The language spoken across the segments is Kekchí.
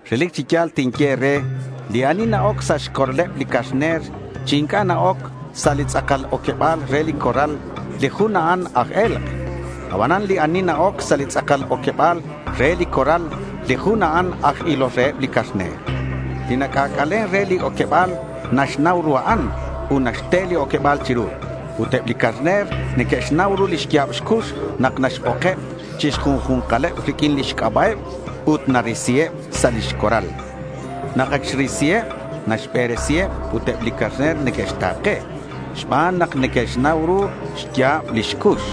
Relic chi ya̱l tinye e̱re, li ani na-oc sa' xcorraleb li carner chi inc'a' na-oc sa' li tz'akal oqueba̱l re li corral, li jun a'an aj e̱lk'. Abanan li ani na-oc sa' li tz'akal oqueba̱l re li corral, li jun a'an aj ilol reheb li carner. Li nac'ac'alen re li oqueba̱l naxnau ru a'an ut naxte li oqueba̱l chiru. Ut eb li carner neque'xnau ru li xya̱b xcux nak naxbokeb chi xju̱nkaleb riq'uin lix c'aba'eb ut narisiheb sa' li corral. Nak ac xrisiheb, naxberesiheb ut eb li carner neque'xta̱ke xban nak neque'xnau ru xya̱b lix cux.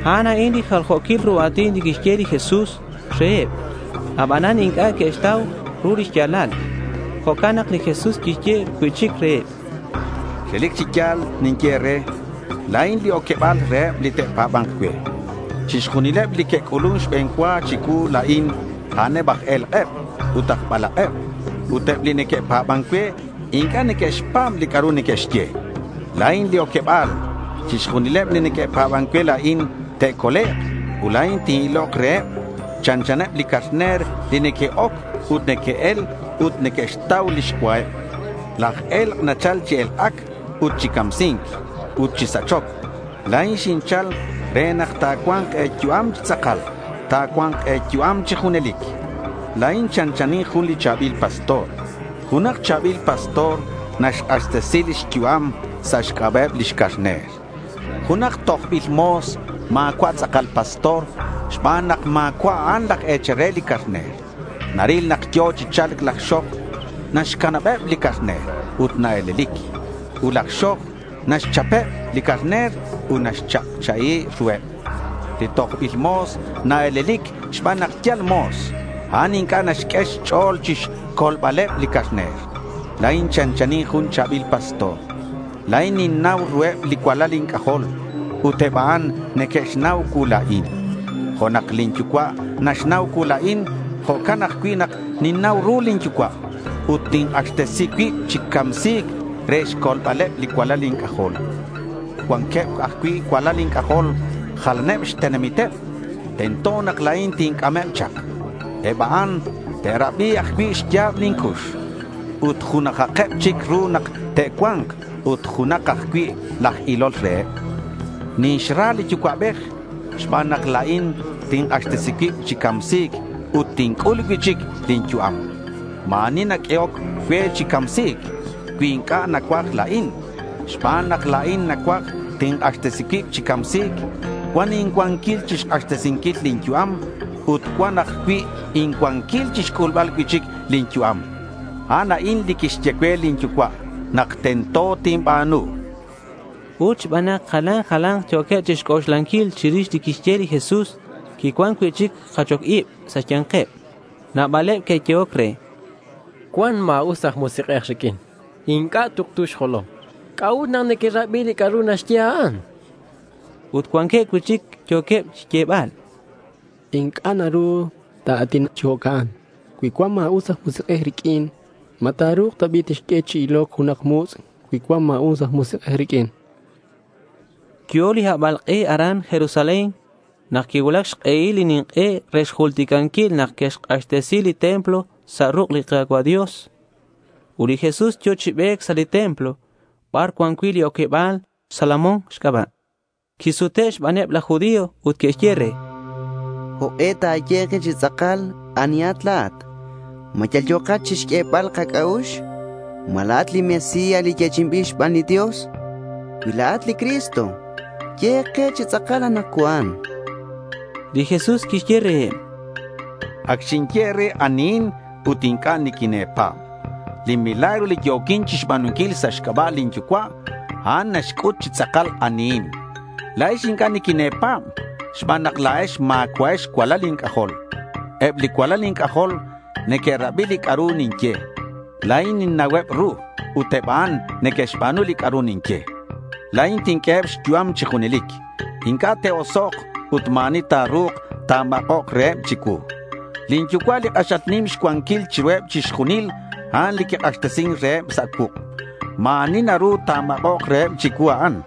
A'an a'in li jaljo̱quil ru a̱tin li quixye li Jesús reheb. Abanan inc'a' que'xtau ru lix ya̱lal. Jo'can nak li Jesús quixye cui'chic reheb: —Relic chi ya̱l ninye e̱re, La̱in li oqueba̱l reheb li te'pa̱ba̱nk cue. Chixjunileb li que'c'ulun xbe̱n cua chicuu la̱in, a'aneb aj e̱lk'eb ut aj balak'eb. Ut eb li neque'pa̱ban cue, inc'a' neque'xpa̱b li c'a'ru neque'xye. La̱in li oqueba̱l. Chixjunileb li neque'pa̱ban cue la̱in, te'colek' ut la̱in tin-ilok reheb. Chanchaneb li carner li neque'oc ut neque'el ut neque'xtau lix cuaheb. Laj e̱lk' nachal chi elk'ac ut chi camsi̱nc ut chi sachoc. La̱in xinchal re nak ta̱cua̱nk e̱yu'am chi tz'akal. Ta̱cua̱nk e̱yu'am chi junelic. La̱in chanchanin jun li cha̱bil pastor. Junak cha̱bil pastor naxk'axtesi lix yu'am sa' xc'aba'eb lix carner. Junak tojbil mo̱s ma̱cua' tz'akal pastor xban nak ma̱cua' a'an laj e̱chal re li carner. Naril nak yo̱ chi cha̱lc laj xoj, naxcanabeb li carner ut nae̱lelic. Ut laj xoj naxchapeb li carner ut naxcha'cha'i ruheb. Li tojbil mo̱s nae̱lelic xban nak yal mo̱s. A'an inc'a' naxq'ue xch'o̱l chixcolbaleb li carner. La̱in chanchanin jun cha̱bil pastor. La̱in ninnau ruheb li cualal inc'ajol. Ut eb a'an neque'xnau cuu la̱in. Jo' nak lin yucua' naxnau cuu la̱in, jo'can ajcui' nak ninnau ru lin yucua' ut tink'axtesi cuib chi camsi̱c re xcolbaleb li cualal inc'ajol. Cuanqueb ajcui' cualal inc'ajol jalaneb xtenamiteb. Tento nak la̱in tinc'ameb chak. Eb a'an te'rabi ajcui' xya̱b lin cux. Ut junajakeb chic ru nak te'cua̱nk ut junak ajcui' laj ilol reheb. Ninxra li Yucua'bej xban nak la̱in tink'axtesi cuib chi camsi̱c ut tinc'ul cui'chic lin yu'am. Ma̱ ani ta̱q'uehok cue chi camsi̱c cui inc'a' nacuaj la̱in. Xban nak la̱in nacuaj, tink'axtesi cuib chi camsi̱c. Cuan incuanquil chixk'axtesinquil lin yu'am. Ut cuan ajcui' incuanquil chixc'ulbal cui'chic lin yu'am. A'an a'in li quixye cue lin Yucua' nak tento tinba̱nu, chan li Jesús. Ut xban nak jalan jala̱nk yo̱queb chixc'oxlanquil chirix li quixye li Jesús, quicuan cui'chic jachoc ib sa' xya̱nkeb. Nabaleb que'yehoc re: —Cuan ma̱us aj musik'ej riq'uin. Inc'a' tuktu xjolom. ¿C'a'ut nak nequerabi li c'a'ru naxye a'an? chanqueb. Ut cuanqueb cui'chic yo̱queb xyebal: —Inc'a' naru ta̱a̱tinak chi jo'can cui cuan ma̱us aj musik'ej riq'uin. ¿Ma ta̱ru̱k ta bi' tixq'ue chi iloc junak mutz' cui cuan ma̱us aj musik'ej riq'uin? chanqueb. Yo̱ li habalk'e aran Jerusalén nak quicuulac xk'ehil li nink'e re xjulticanquil nak que'xk'axtesi li templo sa' ruk' li Ka̱cua' Dios. Ut li Jesús yo̱ chi be̱c sa' li templo bar cuan cui' li oqueba̱l Salomón xc'aba'. Quisute' xbaneb laj judío ut que'xye re: —¿Jok'e ta̱ye ke chi tz'akal anihat? ¿Ma yal yo̱kat chixq'uebal kac'a'ux? ¿Ma la̱at li Mesías, li yechi'inbil xban li Dios? Cui la̱at li Cristo, ye ke chi tz'akal anakcuan, chanqueb. Li Jesús quixye reheb: —Ac xinye e̱re anihin ut inc'a' niquine̱pa̱b. Li milagros li yo̱quin chixba̱nunquil sa' xc'aba' lin Yucua', a'an naxc'ut chi tz'akal anihin. La̱ex inc'a' niquine̱pa̱b xban nak la̱ex ma̱cua'ex cualal inc'ajol. Eb li cualal inc'ajol neque'rabi li c'a'ru ninye. La̱in ninnauheb ru ut eb a'an neque'xba̱nu li c'a'ru ninye. La̱in tinq'ueheb xyu'am chi junelic. Inc'a' te'osok' ut ma̱ ani ta̱ru̱k ta̱mak'ok reheb chicuu. Lin Yucua' li k'axal nim xcuanquil chiruheb chixjunil, a'an li quik'axtesin reheb sa' cuuk'. Ma̱ ani naru ta̱mak'ok reheb chiru a'an.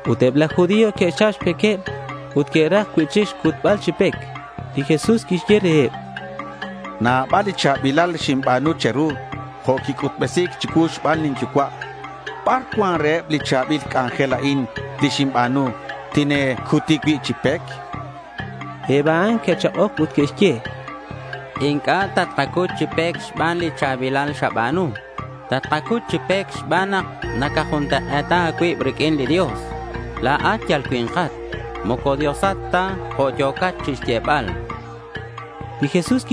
Ut eb laj judío que'xchap xpequeb ut que'raj cui'chic xcutbal chi pec. Li Jesús quixye reheb: —Nabal li cha̱bilal xinba̱nu che̱ru jo' quic'utbesi̱c chicuu xban lin Yucua'. ¿Bar cuan reheb li cha̱bil c'anjel a'in li xinba̱nu tine̱cuti cui' chi pec? chan. Eb a'an que'chak'oc ut que'xye: —Inc'a' tatkacut chi pec xban li cha̱bilal xaba̱nu. Tatkacut chi pec xban nak nacajuntak'e̱ta a̱cuib riq'uin li Dios. La̱at yal cui̱nkat. Moco Diosat ta jo' yo̱cat chixyebal, chanqueb re li Jesús.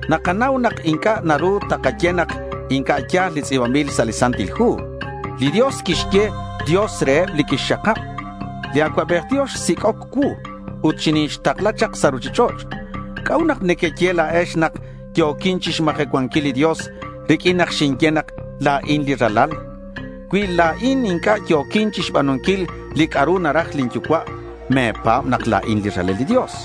Nakanau nak inc'a' naru takaye nak inc'a' ya̱l li tz'i̱banbil sa' li Santil Hu. Li Dios quixye “dios” reheb li quixxakab. Li Acuabej Dios xsic'oc cuu ut xinixtakla chak sa' ruchich'och'. ¿C'a'ut nak nequeye la̱ex nak yo̱quin chixmajecuanquil li Dios riq'uin nak ninye nak la̱in li Ralal? Cui la̱in inc'a' yo̱quin chixba̱nunquil li c'a'ru naraj lin Yucua', me̱pa̱b nak la̱in li Ralal li Dios.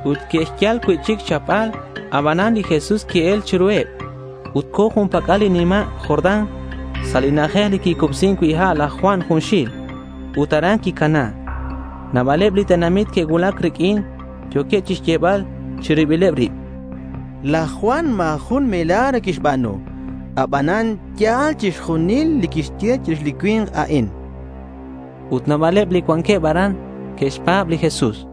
Ut que'xyal cui'chic xchapbal, abanan li Jesús qui-el chiruheb. Ut co̱ jun pac'al li nima' Jordán sa' li na'ajej li quicubsin cui' ha' laj Juan junxil. Ut aran quicana. Nabaleb li tenamit que'cuulac riq'uin. Yo̱queb chixyebal chi ribileb rib: —Laj Juan ma̱ jun milagro quixba̱nu. Abanan ya̱l chixjunil li quixye chirix li cui̱nk a'in, chanqueb. Ut nabaleb li cuanqueb aran que'xpa̱b li Jesús.